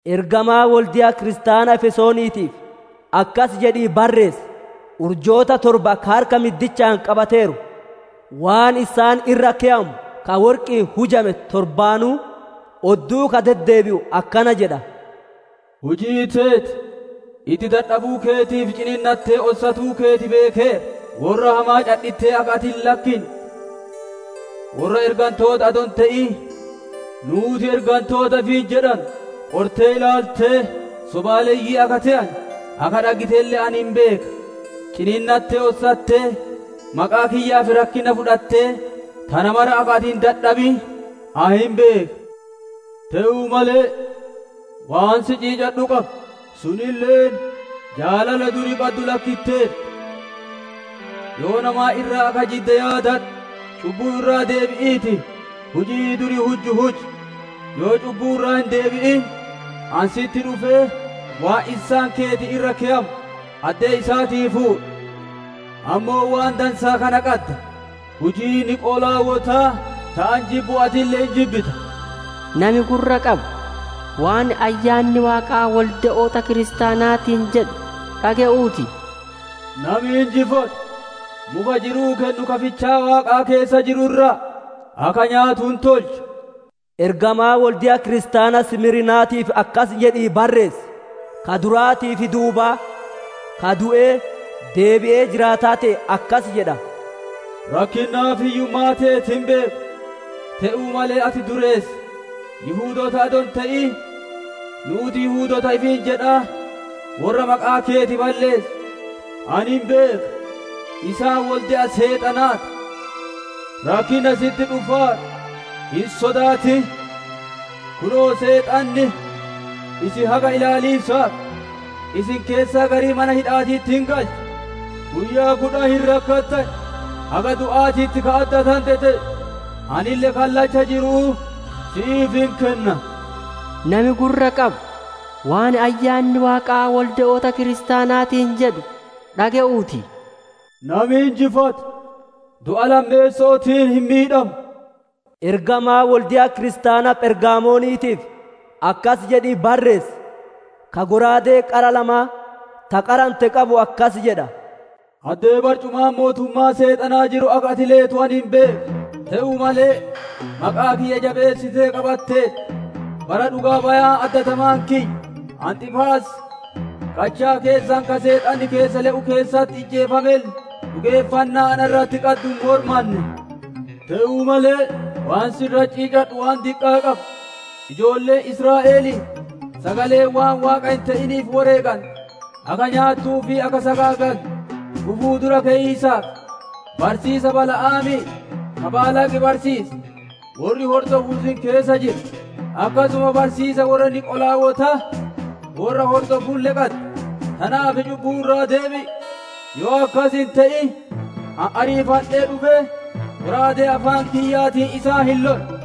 «Ergamaa wolde'a kiristaana Efesooniitiif akkas jedhii barreessi: «Urjoota torba ka harka middichaan qabateeru, waan issaan irra keyamu ka worqi'iin hujame torbaanuu odduu ka deddeebi'u akkana jedha: Hujii teeti, itti dadhabuu keetii fi ciniinnattee ossatuu keeti beekeera. Worra hamaa cadhittee akka ati hin lakkinne, worra ergantoota adoo hin te'in ‹Nuuti ergantoota› ifiin jedhanu qortee ilaaltee sobaaleyyii akka te'ane akka dhaggitelle ani hin beeka. Ciniinnattee ossattee, maqaa kiyyaaf rakkinna fudhattee, tana mara akka ati hin dadhabin ani hin beeka. «Te'uu malee, waan si ciicadhu qaba; sunilleen, jaalala duri qaddu lakkitteerta. Yoona maan irraa akka jidde yaadadhu! Cubbuu irraa deebi'iitii hujii duri hujju huji! Yoo cubbuu irraa hin deebi'in, ani sitti dhufee waan issaan keeti irra keyamu addee isaatii fuudha. Ammoo waan dansaa kana qadda: Hujii Niqolaawotaa ta ani jibbu atille hin jibbita. «Nami gurra qabu, waan Ayyaanni Waaqaa wolde'oota kiristaanaatiin jedhu dhage'uu ti! Nami injifatu, muka jiruu kennu ka fichaa Waaqaa keessa jiru irraa akka nyaatu hin tolcha. «Ergamaa wolde'a kiristaana Simiirnaatiif akkas jedhii barreessi: «Ka duraatii fi duuba, ka du'ee, deebi'ee jiraataa te'e akkasi jedha: Rakkinnaa fi hiyyummaa teeti hin beeka; te'uu malee ati dureessa. Yihudoota adoo hin te'in nuuti Yihudoota ifiin jedhaa worra maqaa keeti balleessu ani hin beeka; isaan wolde'a Seexanaa ti. Rakkinna sitti dhufaaru hin sodaatin. Kunoo, Seexanni isin haga ilaaliisaaf, isin keessaa garii mana hidha'aatitti hin galcha; guyyaa kudhan hin rakkatan. Haga du'aatitti ka addatante te'i; anille kallacha jiru'uu si'iif hin kenna. «Nami gurra qabu, waan Ayyaanni Waaqaa wolde'oota kiristaanaatiin jedhu dhage'uu ti! Nami injifatu du'a lammeesso'ootiin hin miidhamu. «Ergamaa wolde'a kiristaana Phergamooniitiif akkasi jedhii barreessi: «Ka shallaagaa qara lamaa, ka qarame qabu akkas jedha: Addee barcumaan mootummaa Seexanaa jiru akka ati leetu ani hin beeka; te'uu malee maqaa kiyya jabeessitee qabatteerta. Bara dhugaa-bayaan addatamaan kiyya Antiiphaas qachaa keessan ka Seexanni keessa le'u keessatti ijjeefamelle, dhugeeffannaa na irratti qaddu hin mormanne. «Te'uu malee waan si irratti ciicadhu waan diqqaa qaba: Ijoolleen Israa'elii sagalee waan Waaqa hin te'iniif woreegante akka nyaattuu fi akka sagaagaltu gufuu dura keyiisaaf, barsiisa Bala'aamii ka Baalaaq barsiise worri hordofu isin keessa jira. Akkasuma barsiisa worra Niqolaawotaa worra hordofulle qadda. Tanaaf cubbuu irraa deebi'i; yoo akkas hin te'in, ani ariifadhee dhufee, shallaagaa afaan kiyyaatiin isaan hin lola.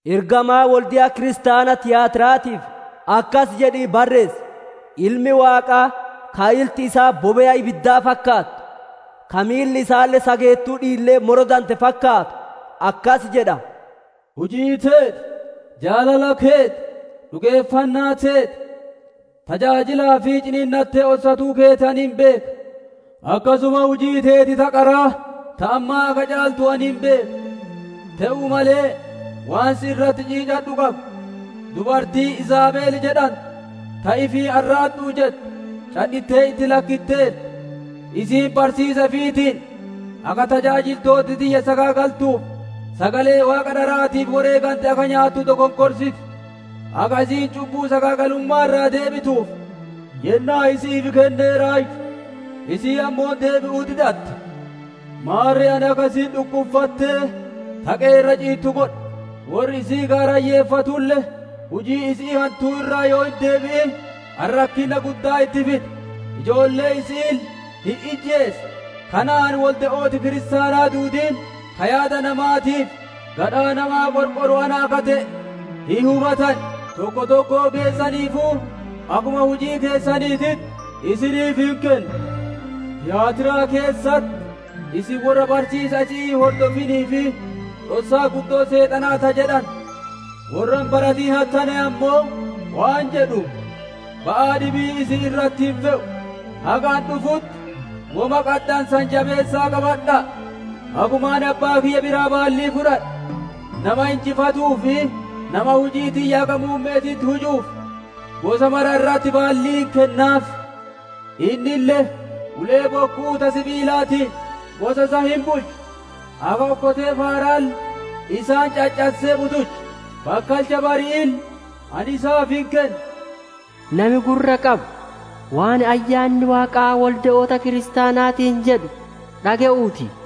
«Ergamaa wolde'a kiristaana Tiyaatira'aatiif akkas jedhii barreessi: «Ilmi Waaqaa, ka ilti isaa bobe'a ibiddaa fakkaattu, ka miilli isaalle sageettuu dhiillee morodante fakkaatu akkas jedha: Hujii teeti, jaalala keeti, dhugeeffannaa teeti, tajaajilaa fi ciniinnatee ossatuu keeti ani hin beeka; akkasuma hujiin teeti ta qaraa ta ammaa akka caaltu ani hin beeka. «Te'uu malee waan si irratti ciicadhu qaba: Dubartii Iizaabel jedhantu ta ifiin, ‹Ani raaddu'u› jettu cadhittee itti lakkitteerta. Isiin barsiisa ifiitiin akka tajaajiltooti tiyya sagaagaltuu fi sagalee waaqa dharaatiif woreegante akka nyaattu dokonkorsiti. Akka isiin cubbuu sagaagalumma'aa irraa deebituuf yennaa isi'iif kenneeraayyu; isiin ammoo deebi'uu didatte. Maarre ani akka isiin dhukkuffattee taqee irra ciittu godha, worri isii gaarayyeeffatulle hujii isi'ii hantuu irraa yoo hin deebi'in, ani rakkinna guddaa itti fida. Ijoollee isi'iille hin ijjeesa; kanaan wolde'ooti kiristaanaa duudiin, ka yaadaa namaatii fi gadhaa namaa qorqoru ana akka te'e hin hubatan. Tokko tokkoo keessaniifuu akkuma hujii teessaniititti isiniif hin kenna. «Tiyaatiraa keessatti, isin worra barsiisa isi'ii hin hordofinii fi ‹Dhossaa guddoo Seexanaa› ta jedhante worra hin baratin hattaneen ammoo, waan jedhu: Ba'aa dhibii isin irratti hin fe'u; haga ani dhufutti woma qaddanu san jabeessa'aa qabadha'a. Akkuma ani abbaa kiyya biraa baallii fudhadhe, nama injifatuu fi nama hujii tiyya haga muumme'eetitti hujuuf, gosa mara irratti baallii hin kennaaf; innille, ulee bokku'uu ta sibiilaatiin gosa san hin bulcha; akka okkotee faaraalle isaan caccassee butucha. Bakkalcha bari'iille ani isaaf hin kenna. «Nami gurra qabu waan Ayyaanni Waaqaa wolde'oota kiristaanaatiin jedhu dhage'uu ti!» ta jettu.